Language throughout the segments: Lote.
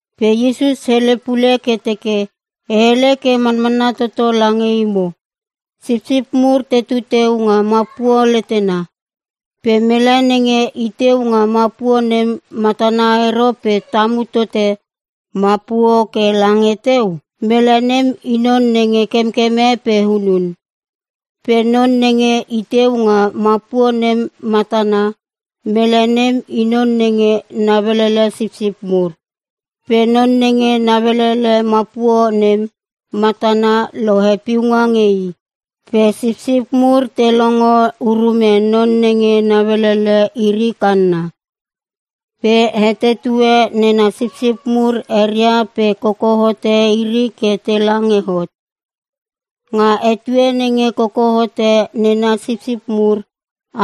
Pe Iesus hele pule ke teke, “E hele ke manmanna toto lange imo. Sipsip mur tetu teu nga mapuo letena. Pe mele nenge i teu nga mapuo nem matana ero pe tamu tote mapuo ke lange teu, mele nem i non nenge kemkeme pe hunun. Pe non nenge i teu nga mapuo nem matana, mele nem i non nenge nauelele sipsip mur. Pe non nenge nauelele mapuo nem matana lohe piunga nge i. Pe sipsip mur te longo urume non nenge nauelele iri kanna. Pe hetetue nena sipsip mur eria pe koko hote iri ke tela nge hot. Nga etue nenge koko hote nena sipsip mur,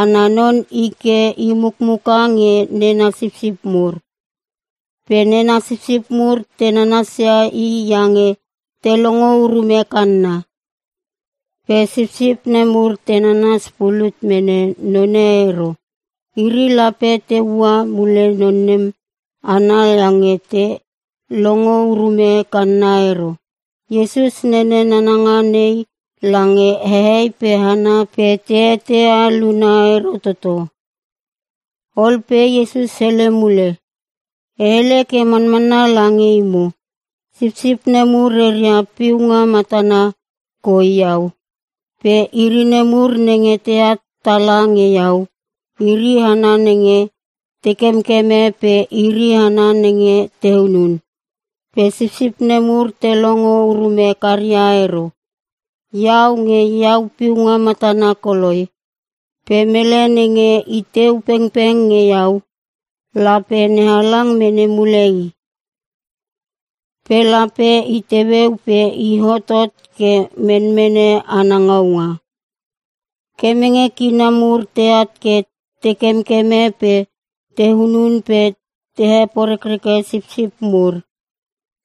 ana non i ke i mukmuka nge nena sipsip mur. Pe nena sipsip mur te nanasia i iange te longo urume kanna. Pe sipsip nemur te nanas pulut mene none ero. Iri lape te ua mule non nem ana iange te longo urume kanna ero.” Iesus nene nananga nei lange hehei pe hana pe te eteia luna ero toto. Ol pe Iesus hele mule, “E hele ke manmanna lange imo, sipsip nemur reria piunga matana koi iau. Pe iri nemur nenge teat tala nge iau, iri hana nenge te kemkeme pe iri hana nenge te hunun. Pe sipsip nemur te longo urume karia ero. Iau nge iau piunga matana koloi. Pe mele nenge iteu pengpeng nge iau, lape NeHalang mene mule i. Pe lape i teueu pe i hotot ke menmene ana ngaunga. Kemenge kina mur teat ke te kemkeme pe te hunun pe te heporeke sipsip mur.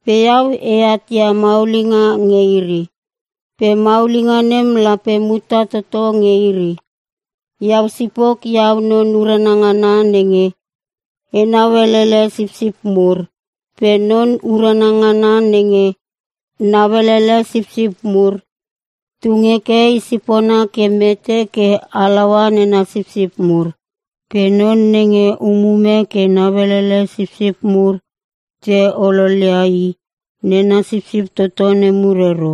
Pe iau eat ia maulinga nge iri. Pe maulinga nem lape muta toto nge iri. “Iau sipok, iau non urana ngana nenge enau elele sipsip mur. Pe non urana ngana nenge nauelele sipsip mur, tung heke i sipona ke mete ke halaua nena sipsip mur. Pe non nenge umume ke nauelele sipsip mur pe te ololia i, nena sipsip toto nemur ero.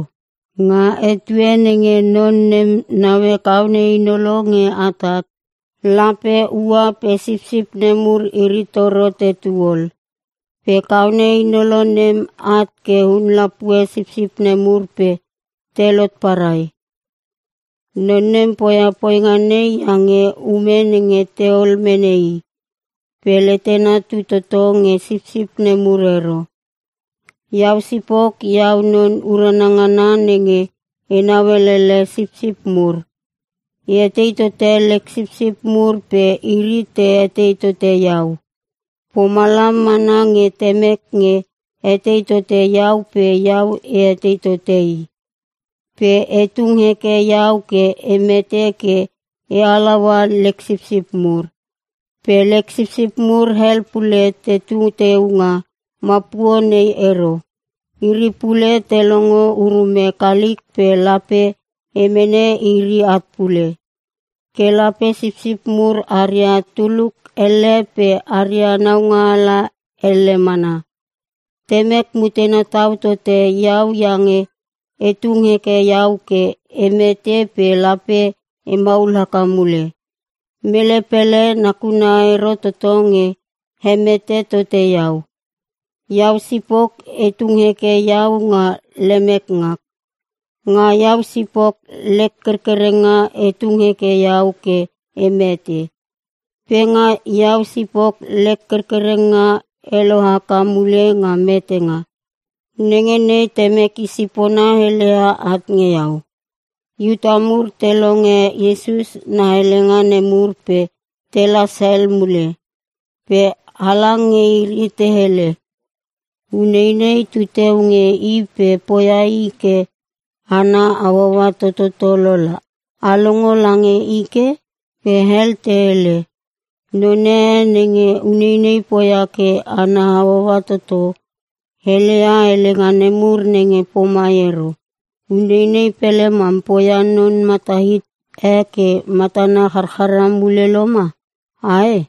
Nga etue nenge non nem naue kaone hinolo nge atat, lape ua pe sipsip nemur iri toro tetu ol. Pe kaone hinolo nem at ke hun lapue sipsip nemur pe telot parai. Non nem poia poinga nei iange ume nenge teol mene i. Pe letena tu toto nge sipsip nemur ero. “Iau sipok, iau non urana ngana nenge enau elele sipsip mur. E etei tote lek sipsip mur pe iri te etei tote iau. Pomalam mana nge Temek nge etei tote iau pe iau e etei tote i. Pe e tung heke iau ke e mete ke e halaua lek sipsip mur. Pe lek sipsip mur hel pule tetu teu nga mapuo nei ero. Iri pule te longo urume kalik pe lape e mene iri at pule. Ke lape sipsip mur aria tuluk elle pe aria naungaala elle mana. Temek mutena tau tote iau iange e tung heke iau ke e mete pe lape e maul haka mule. Mele pele nakuna ero toto nge hemete tote iau. Iau sipok e tung heke iau nga lemek ngak. Nga iau sipok lek kerkerenga e tung heke iau ke e mete. Pe nga iau sipok lek kerkerenga e lohaka mule nga metenga. Nenge nei Temek i sipona heleia at nge iau.” Iuta mur te longe Iesus na helenga nemur pe telas hel mule. Pe halang nge iri te hele, “Uneinei tu teu nge i pe poia i ke ana hauaua tototo lola. A longo lange i ke?” Pe hel te hele, “Non e nenge uneinei poia ke ana hauaua toto, heleia helenga nemur nenge pomai ero. Uneinei pele mam poia non mata hit e ke matana charchara mule loma, ae?”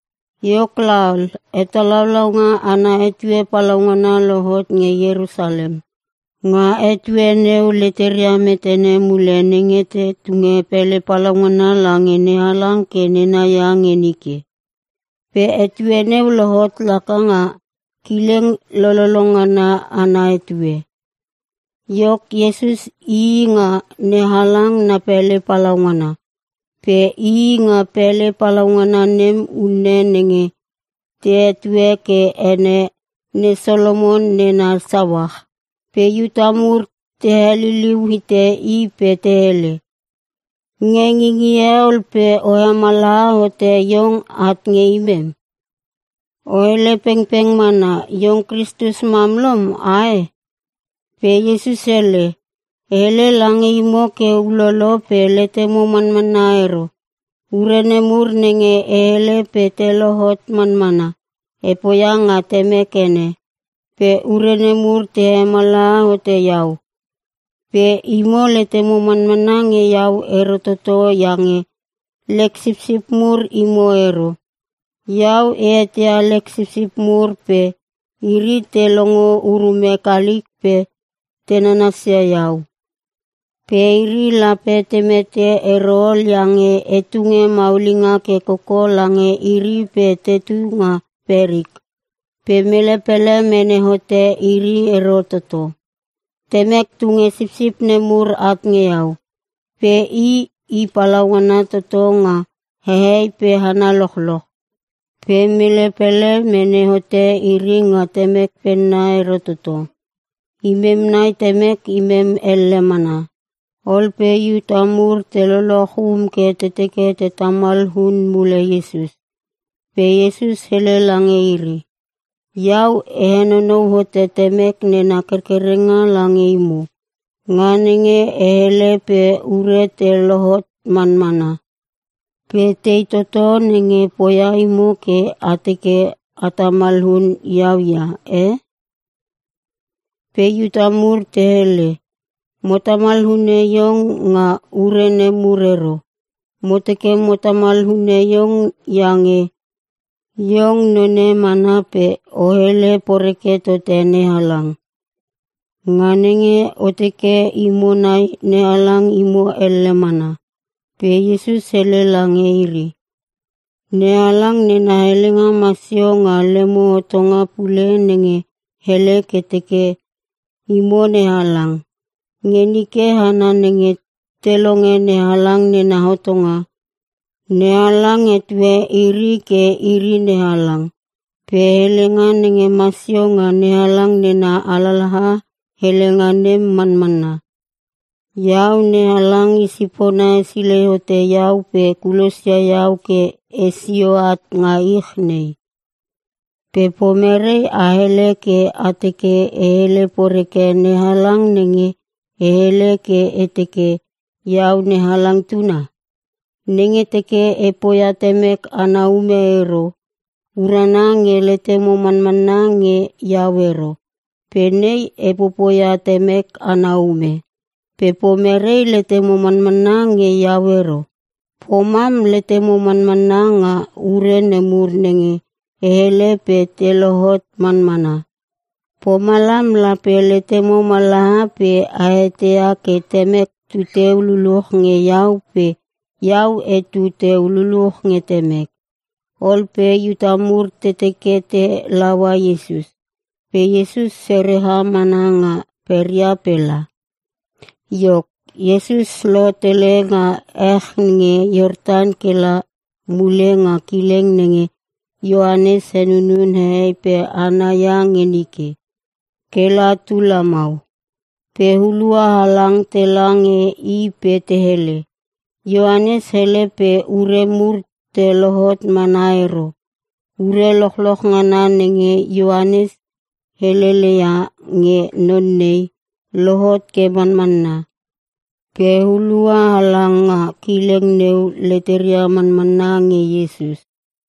Iok laol, hetalaulaunga ana etue palaungana lohot nge Ierusalem. Nga etue neu leteria metene mule nenge te tunge pele palaungana lange NeHalang ke nena ia nge nike. Pe etue neu lohot laka nga kileng lololo ngana ana etue. Iok, Iesus ii nga NeHalang na pele palaungana. Pe ii nga pele palaungana nem unne nenge te etue ke ene Ne Solomon Nena Sauach. Pe Iuta mur te heliliu hite i pe te hele, “Nge ngingie ol pe o hemallaha hote iong at nge imem? O hele pengpeng mana, iong Kristus mam lom ae?” Pe Iesus hele, “E hele lange imo ke ulolo pe letemo manmanna ero. Ure nemur nenge e hele pe te lohot manmana, e poia nga Temek ene. Pe ure nemur te hemallaha hote iau. Pe imo letemo manmanna nge iau ero toto iange lek sipsip mur imo ero. Iau e eteia lek sipsip mur pe iri te longo urume kalik pe te nanasia iau. Pe iri lape te mete ero ol iange e tunge maulinga ke koko lange iri pe tetu nga perik. Pe mele pele mene hote iri ero toto. Temek tunge sipsip nemur at nge iau. Pe i, i palaungana toto nga hehei pe hana lochloch. Pe mele pele mene hote iri nga Temek penna ero toto. Imem nai Temek imem elle mana.” Ol pe Iuta mur te lochloch um ke te teke te tamal hun mule Iesus. Pe Iesus hele lange iri, “Iau e henonou hote Temek nena kerkerenga lange imo, nga nenge e hele pe ure te lohot manmana. Pe tei toto nenge poia imo ke a teke a tamal hun iau ia, e?” Pe Iuta mur te hele, “Mo tamal hune iong nga ure nemur ero. Mo teke mo tamal hune iong iange, iong none mana pe o hele poreke tote NeHalang, nga nenge o teke imo nai NeHalang imo elle mana!” Pe Iesus hele lange iri, “NeHalang nena helenga masio nga lemo hotonga pule nenge hele ke teke, ‘Imo nehalang.’ Nge nike hana nenge te longe NeHalang nena hotonga, NeHalang hetue iri ke iri nehalang. Pe helenga nenge masio nga NeHalang nena alalaha helenga nem manmanna. Iau NeHalang i sipona hesilei hote iau pe kulosia iau ke esio at nga ich nei. Pe pomerei a hele ke a teke e hele poreke NeHalang nenge e hele ke e teke, ‘Iau NeHalang Tuna’? Nenge teke e poia Temek ana ume ero, urana nge letemo manmanna nge iau ero. Pe nei e popoia Temek ana ume. Pe pomerei letemo manmanna nge iau ero? Pomam, letemo manmanna nga ure nemur nenge e hele pe te lohot manmana. Pomalam lape letemo mallaha pe a eteia ke Temek tuteu luluch nge iau pe iau etu teu luluch nge Temek.” Ol pe Iuta mur te teke te laua Iesus, pe Iesus sereha mana nga peria pe la. Iok, Iesus lotele nga ech nge Iortan kela mule nga kileng nenge Ioanes henunun hehei pe hana ia nge nike, kela tu lamau. Pe hulua halang tela nge i pe te hele, “Ioanes hele pe ure mur te lohot mana ero. Ure lochloch ngana nenge Ioanes helele ia nge non nei, lohot ke manmanna.” Pe hulua halang nga kileng neu leteria manmanna nge Iesus.